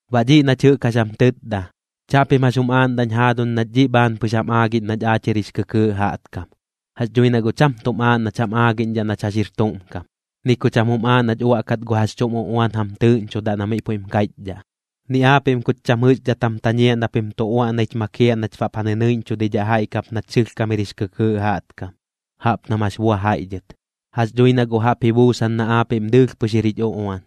Baꞌ dhiꞌ nach jɨꞌk jax jam tɨtda, chaꞌpim jax jum aaꞌndaꞌñ jaaduñ nach dhiꞌ bhaan pɨx jam aagiꞌñ nach aach jir jix kɨkɨɨꞌ jaꞌtkam. Jax dhui na guꞌ cham tuꞌm aaꞌ nach jam aagiꞌñdhaꞌ nach jax jir tuꞌm kam, ni ku cham jum aaꞌ nach uaꞌkat gu jax chuꞌm uꞌuan jam tɨɨꞌñchodaꞌ na miꞌ puiꞌm kaiꞌchdhaꞌ, ni aapiꞌm kuch cham jɨꞌxdhat jam tañiaꞌ na pim tu uaꞌnaich makiaꞌ nach baꞌp ja nɨnɨiꞌñchudidhaꞌ jaiꞌ kap nach sɨlhkam jir jix kɨkɨɨꞌ jaꞌtkam, jaꞌp nam jax bua jaiꞌ dhɨt. Jax dhui na guꞌ jaꞌp ji buusan na aapiꞌm dɨɨlh pɨx jir jich uꞌuan,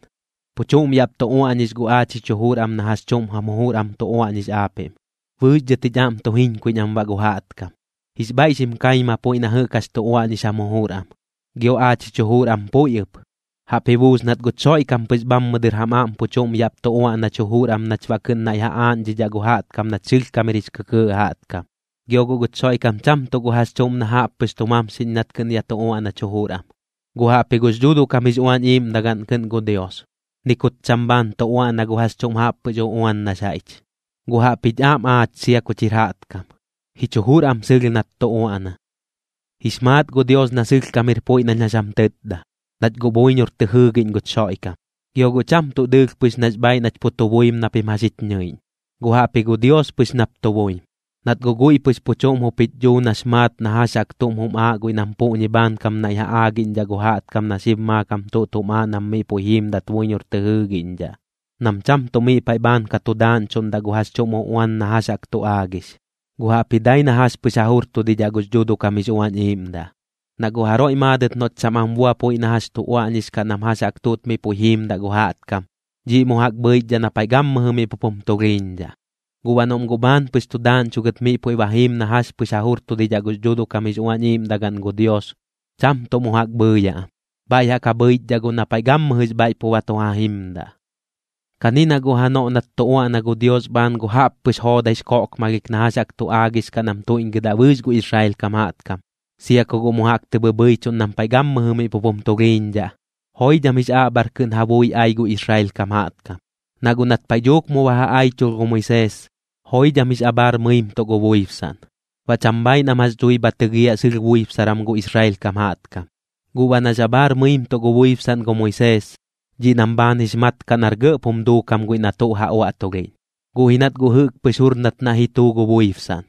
pu chuꞌm yaꞌp tu uaꞌñix guꞌ aach jich jujur am na jax chuꞌm jam jujur am tu uaꞌñix aapiꞌm, bɨɨx dhɨt jich aꞌm tu jiñkuiꞌñ am baꞌ gu jaꞌtkam. Jix bhaiꞌ xim kaima puiꞌ na jɨꞌk jax tu uaꞌñix jam jujur am, gio aach jich jujur am puiꞌ ɨp. Jaꞌp ji buus nat guch Xoiꞌkam pɨx bhammɨ dɨr jam aꞌm pu chuꞌm yaꞌp tu uaꞌnach jujur am nach baꞌ kɨꞌn naiꞌ ja aaꞌñdhidhaꞌ gu jaꞌtkam nach sɨlhkam jir jix kɨkɨɨꞌ jaꞌtkam. Gio guꞌ guch Xoiꞌkam cham tuꞌ gu jax chuꞌm na jaꞌp pɨx tu mamxiꞌñ nat kɨꞌn yaꞌ tu uaꞌnach jujur am, guꞌ jaꞌpji gux Dhuuduꞌ kam jix Uañ Iiꞌmdagaꞌn kɨꞌn gu Dios. Ni kut cham bhaan tu uaꞌna gu jax chuꞌm jaꞌppɨx uꞌuan nax jaiꞌch, guꞌ jaꞌpjich aꞌm aach sia kuch jir jaꞌtkam, jich jujur am sɨlh nat tu uaꞌna. Jix maat gu Dios na sɨlhkam jir puiꞌ nañ jax jam tɨtda, nach guꞌ buiñor tɨ jɨɨgiꞌñ guch Xoiꞌkam. Gio guꞌ cham tuꞌ dɨɨlh pɨx nax bhaaiꞌ nach pu tu buim na pim jax jich ñɨiꞌñ, guꞌ jaꞌpji gu Dios pɨx nap tu buim. Nat guꞌ guiꞌ pɨx pu chuꞌm jup jich dhuu nax maat na jax jaꞌk tuꞌm jum aaꞌ guiꞌ nam puꞌñi bhaankam naiꞌ ja aagiꞌñdhaꞌ gu jaꞌtkam na xib maakam tuꞌt jum aaꞌ nam miꞌ puiꞌ jiimdat buiñor tɨ jɨɨgiꞌñdhaꞌ, nam cham tuꞌ miꞌ paiꞌ bhaan ka tu daaꞌñchuꞌndaꞌ gu jax chuꞌm uꞌuan na jax jaꞌk tu aagix, guꞌ jaꞌpji dai na jax pɨx ja jurtudidhaꞌ gux Dhuuduꞌ kam jix Uañ Iiꞌmdaꞌ. Na guꞌ jaroiꞌ maadɨt noꞌt cham am bua puiꞌ na jax tu uaꞌñix kaꞌ nam jax jaꞌk tuꞌt miꞌ puiꞌ jiimdaꞌ gu jaꞌtkam, dhiꞌ mu jaꞌk bhɨichdhaꞌ na paiꞌ gammɨjɨ miꞌ pup jum tulhiiñdhaꞌ. Guꞌ baꞌ noꞌm guꞌ bhaan pɨx tu daaꞌñchugɨt miꞌ puiꞌ ba jiim na jax pɨx ja jurtudidhaꞌ gux Dhuuduꞌ kam jix Uañ Iiꞌmdagaꞌn gu Dios, cham tuꞌ mu jaꞌk bhɨɨyaꞌ am, bhaiꞌ jaꞌk ja bhɨichdhaꞌ guꞌ na paiꞌ gammɨjɨx bhaiꞌ pu ba tu ja jimdaꞌ. Kani na guꞌ janoꞌ nat tu uaꞌna gu Dios bhaan gu jaꞌppɨx joodaix koꞌkmalhik na jax jaꞌk tu aagix kaꞌ nam tuiꞌñgɨdaꞌ bɨɨx gu Israel kam, sia ku guꞌ mu jaꞌk tɨ bhɨbhɨichuꞌn nam paiꞌ gammɨjɨ miꞌ pup jum tulhiiñdhaꞌ, joidham jix aꞌbhar kɨꞌn ja bui ai gu Israel kam jaꞌtkam. Na guꞌ nat paiꞌ dhuuk mu ba ja aichulh gu Moisees, joidham jix abhaar mɨimtuꞌ gu buibsaꞌn, baꞌ cham bhaaiꞌ nam jax dhui bha tɨgiaꞌ sɨlh buibsaram gu Israel kam jaꞌtkam. Guꞌ baꞌ nax abhaar mɨimtuꞌ gu buibsaꞌn gu Moisees, dhiꞌ nam bhaan jix mat kaꞌ nar gɇꞌp jum duukam guiꞌ na tuꞌ ja uaꞌtulhiꞌñ, guꞌ ji nat guꞌ jɨꞌk pɨx jur nat naiꞌ ji tuu gu buibsaꞌn.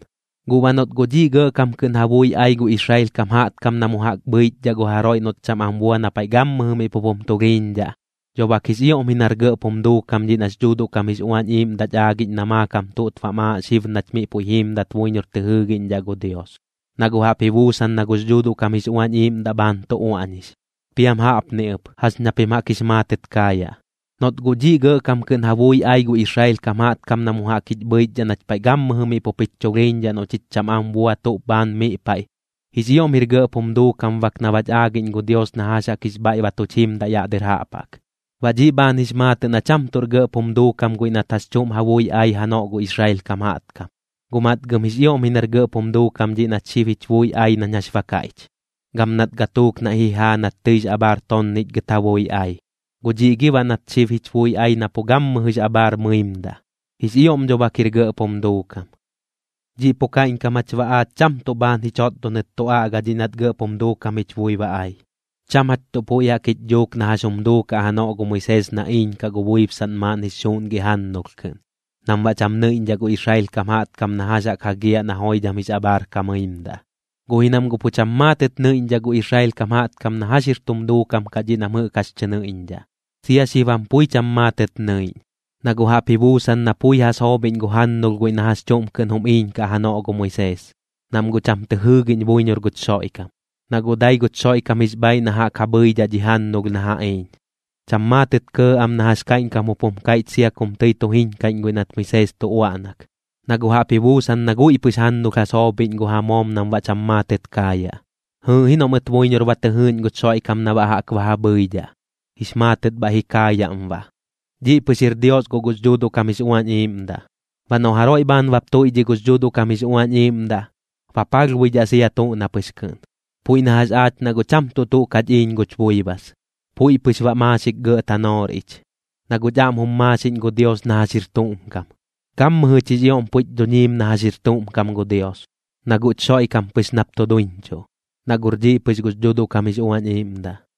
Guꞌ baꞌ noꞌt guꞌ dhiꞌ gɇꞌkam kɨꞌn ja bui ai gu Israel kam jaꞌtkam na mu jaꞌk bhɨichdhaꞌ gu jaroiꞌ noꞌt cham am bua na paiꞌ gammɨjɨ miꞌ pup jum tulhiiñdhaꞌ, dho bak jix ioꞌm ji nar gɇꞌp jum duukam dhiꞌ nax Dhuuduꞌ kam jix Uañ Iiꞌmdaꞌch aagiꞌñ na maakam tuꞌt bam aaꞌ xib nach miꞌ puiꞌ jiimdat buiñor tɨ jɨɨgiꞌñdhaꞌ gu Dios, na guꞌ jaꞌp ji buusan na gux Dhuuduꞌ kam jix Uañ Iiꞌmdaꞌ bhaan tu uaꞌñix. Piam jaꞌpni ɨp, jax ña pim jaꞌk jix maatɨt kaayaꞌ: Noꞌt guꞌ dhiꞌ gɇꞌkam kɨꞌn ja bui ai gu Israel kam jaꞌtkam na mu jaꞌk jich bhɨichdhaꞌ nach paiꞌ gammɨjɨ miꞌ pup jich chulhiiñdhaꞌ noꞌ chich cham am bua tuꞌ bhaan miꞌ paiꞌ, jix ioꞌm jir gɇꞌp jum duukam bak na bach aagiꞌñ gu Dios na jax jaꞌk jix bhaiꞌ ba tuch jimdaꞌ yaꞌ dɨr jaꞌp jaꞌk. Baꞌ dhiꞌ bhaan jix maatɨꞌ na cham tuꞌr gɇꞌp jum duukam guiꞌ nat jax chuꞌm ja bui ai janoꞌ gu Israel kam jaꞌtkam, guꞌ matgɨm jix ioꞌm ji nar gɇꞌp jum duukam dhiꞌ nat xib jich bui ai nañ jax ba kaiꞌch. Gam nat gatuuk naiꞌ ji jaa nat tɨix abhaar tonnichgɨt ja bui ai, ¿guꞌ dhiꞌ gi baꞌ nat xib jich bui ba ai na pu gammɨjɨx abhaar mɨimdaꞌ? Jix ioꞌm dho bak jir gɇꞌp jum duukam. Dhiꞌ pu kaiꞌñkam jach baꞌ aach cham tuꞌ bhaan ji chotdonɨt tu aꞌga dhiꞌ nat gɇꞌp jum duukam jich bui ba ai. Cham jach tuꞌ puiꞌ jaꞌk jich dhuuk na jax jum duukaꞌ janoꞌ gu Moisees na iiñkaꞌ gu buibsaꞌn maaꞌn jix xuuꞌngiꞌ jannulh kɨꞌn, nam baꞌ cham nɨiꞌñdhaꞌ gu Israel kam jaꞌtkam na jax jaꞌk jagiaꞌ na joidham jix abhaar ka mɨimdaꞌ. Guꞌ ji nam guꞌ pu cham maatɨt nɨiꞌñdhaꞌ gu Israel kam jaꞌtkam na jax jir tum duukam kaꞌ dhiꞌ nam jɨꞌk jax tɨ nɨiꞌñdhaꞌ, sia xib jam pui cham maatɨt nɨiꞌñ. Na guꞌ jaꞌp ji buusan na pui ja soobhiꞌñ gu jannulh guiꞌ na jax chuꞌm kɨꞌn jum iiñkaꞌ janoꞌ gu Moisees, nam guꞌ cham tɨ jɨɨgiꞌñ buiñor guch Xoiꞌkam, na guꞌ dai guch Xoiꞌkam jix bhaaiꞌ na jaꞌk ja bhɨidhaꞌ dhi jannulh na ja iiñ. Cham maatɨt kɇɇ am na jax kaiꞌñkam jup jum kaiꞌch sia kum tɨi tu jiñkaiꞌñ guiꞌ nat jɨꞌk Moisees tu uaꞌnak, na guꞌ jaꞌp ji buusan na guiꞌ pɨx jannulh ja soobhiꞌñ gu ja moom nam baꞌ cham maatɨt kaayaꞌ. Jɨɨꞌ ji noꞌ mɨt buiñor ba tɨ jɨɨꞌñ guch Xoiꞌkam na baꞌ jaꞌk ba ja bhɨidhaꞌ, jix maatɨt bhaiꞌ ji kaayaꞌm baꞌ. Dhiꞌ pɨx jir Dios guꞌ gux Dhuuduꞌ kam jix Uañ Iiꞌmdaꞌ. Baꞌ noꞌ jaroiꞌ bhaan bap tuiꞌdhiꞌ gux Dhuuduꞌ kam jix Uañ Iiꞌmdaꞌ, ba palhbuidhaꞌ sia tuꞌ na pɨx kɨꞌn. Puiꞌ na jax aach na guꞌ cham tuꞌ tuꞌ kach iiñ guch buibas, puiꞌ pɨx baꞌ maaxik gɇꞌ tanoor ich, na guꞌch aꞌm jum maaxiꞌñ gu Dios na jax jir tuꞌm kam. Gammɨjɨch jix ioꞌm puiꞌch dhuñiim na jax jir tuꞌm kam gu Dios, na guꞌch Xoiꞌkam pɨx nap tu duiñchuꞌ, na guꞌr dhiꞌ pɨx gux Dhuuduꞌ kam jix Uañ Iiꞌmdaꞌ.